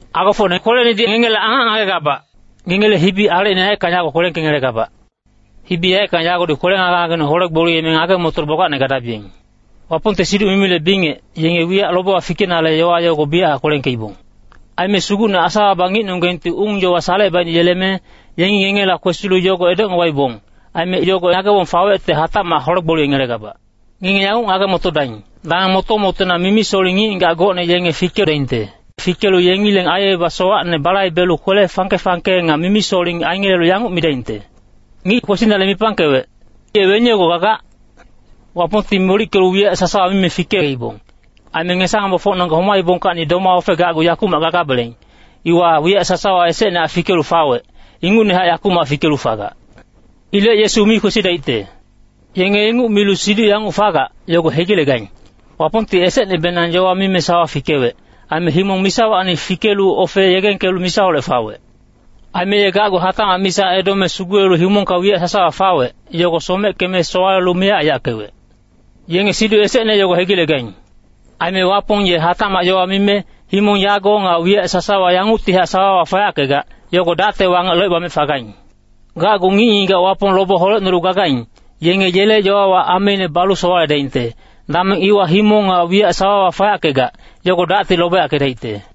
Agofocne kwelenedi ngengele angac ngagegabac, ngengele hibi alecine yaeckang yago kwelengkengelegabac. Hibi yaeckang yagodi kwele ngage-ngagengineng hole-gboliyeme ngage-motolu gbagbacne gadabiyeng. Wapongte siduc-mimile bingec, yenge wiyac lobewa fikenale yowa yogo biyachac kwelengkeibong. Aime Sugucne Asa-baba ngicnonggengti ung-yowa salecebaicne yeleme, yengi ngengela kwesilu yogo edocngebaibong. Aime yogo ngagebong fawecte hatacmac hole-gboliyengelegabac. Ngenge yanguc ngage-motodaing, dameng moto-motoina mimi-soling ngic-ngigac gocne yenge fikedaingte. Fikelu yengileng aibaba sowacne balaibelu kwele fangke-fangke nga mimi-soling aingelelu yanguc midaingte, “Ngic kwesinale mipangkewec, ye weni yogo gagac? Wapongti molickelu wiyac sasawa mime fikeibong. Aime ngesa-mamacfocnonggeng homaibongkacni doma ofegacgu yakumac gagabeleng, iwa wiyac sasawa esecnehac fikelu fawec, ingucnehac yakumac fikelu fagac. Ilec Yesu mi kwesidaicte.” Yenge inguc milu siduc yanguc fagac, yogo hegilegaing. Wapongti esecnebenang yowa mime sawa fikewec, aime himong misawacni fikelu ofe yegengkelu misaholec fawec. Aime ye gacgu hatacmac misa edome sugulelu himongka wiyac sasawa fawec, yogo someckeme sowalelu miyac aiyackewec. Yenge siduc esecne yogo hegilegaing. Aime Wapong ye hatacmac yowa mime, himong yago nga wiyac sasawa yanguctihac sawawa fayackegac, yogo dacte wangec locebame fagaing. Gacgu ngic-ngigac Wapong lobe holecnolu gagaing, yenge yele yowawa ameine balu sowaledaingte, dameng iwa himong nga wiyac sawawa fayackegac, yogo dacti lobeyackedaicte.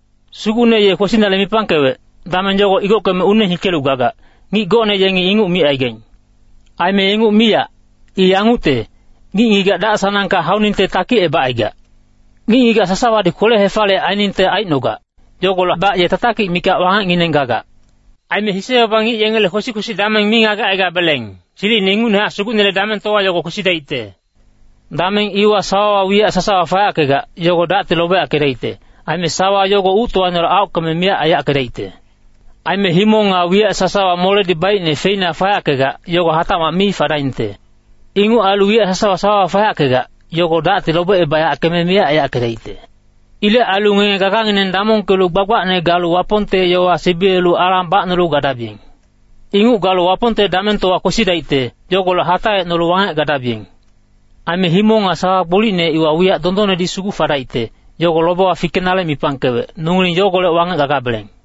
Sugucne ye kwesinale mipangkewec, dameng yogo igockeme uneng hikelu gagac, ngic gocne yengi inguc micaigaing. Aime inguc miyac. I yangucte, ngic-ngigac dac-sanangka hauningte takicebacaigac. Ngic-ngigac sasawadi kwele-hefaliyec ainingte aicnogac, yogolecbac ye tatakic mikac wangecngineng gagac. Aime hise-baba ngic yengele kwesi-kwesi dameng mi ngagecaigabeleng, silicine ingucnehac Sugucnele damengtowa yogo kwesidaicte. Dameng iwa sawawa wiyac sasawa fayackegac, yogo dacti lobeyackedaicte. Aime sawa yogo uctowaineholec aockeme miyac aiyackedaicte. Aime himong nga wiyac sasawa moledi baicne feina fayackegac, yogo hatacmac mi fadaingte. Inguc ailu wiyac sasawa sawawa fayackegac, yogo dacti lobocebayackeme miyac aiyackedaicte. Ilec ailu ngenge gagangineng damongkelu gbagbacne galu Wapongte yowa sebilelu alang bacnolu gadabiyeng. Inguc galu Wapongte damengtowa kwesidaicte, yogolec hataecnolu wangec gadabiyeng. Aime himong nga sawa gbolicne iwa wiyac dondonnedi sugu fadaicte, yogo lobewa fikenale mipangkewec, nongileng yogolec wangec gagabeleng.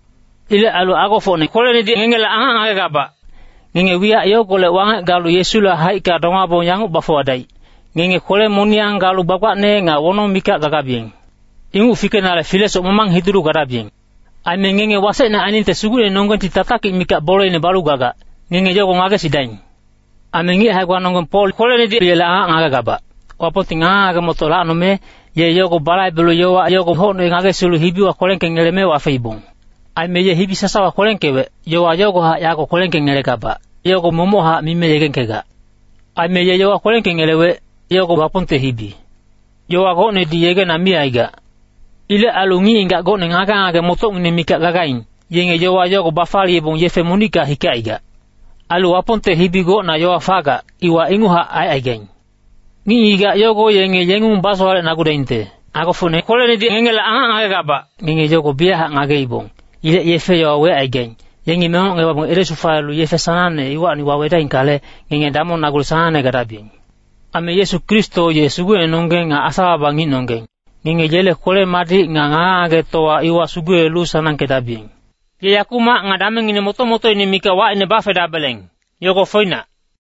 Ilec ailu agofocne kwelenedi ngengele angac ngagegabac, ngenge wiyac yogolec wangec galu Yesule haicka domabong yanguc bafuwadaic, ngenge kwele-moniyang galu gbagbacne nga wonong mikac gagabiyeng. Inguc fikenale filesoc mamang hidulu gadabiyeng. Aime ngenge wasecne ainingte Sugucnenonggengti tatakic mikac boleine balu gagac, ngenge yogo ngagesidaing. Aime ngic hae-gbanonggeng Pol kwelenedi yele angac ngagegabac, Wapongti ngage-ngage-motoc lacnome, ye yogo balaibelu yowa yogo hocne ngagesilu hibiwa kwelengkengeleme wafeibong. Aime ye hibi sasawa kwelengkewec, yowa yogohac yago kwelengkengelegabac, yogo momochac mime yegengkegac. Aime ye yowa kwelengkengelewec, yogo Wapongte hibi. Yowa gocnedi yegena mi aigac. Ilec ailu ngic-ngigac gocne ngage-ngage-motocngineng mikac gagaing, yenge yowa yogo bafaliyebong yefe monicka hikecaigac. Ailu Wapongte hibi gocna yowa fagac, iwa inguchac aicaigaing. Ngic-ngigac yogo yenge yengung basowalecnagudaingte. Agofocne kwelenedi ngengele angac ngagegabac, ngenge yogo biyachac ngageibong. Ilec yefe-yowa wecaigaing, yengi mengocngebabong ede-sufalelu yefe sanangne iwacni wawedaingkale, ngenge damongnagulu sanangne gadabiyeng. Aime Yesu Kristo ye Sugucnenonggeng nga Asa-baba ngicnonggeng, ngenge yele kwele-madic nga ngage-ngagetowa iwa sugulelu sanangkedabiyeng. Ye yakumac nga damengngine moto-motoine mikac wacine bafedabeleng, yogo foinac.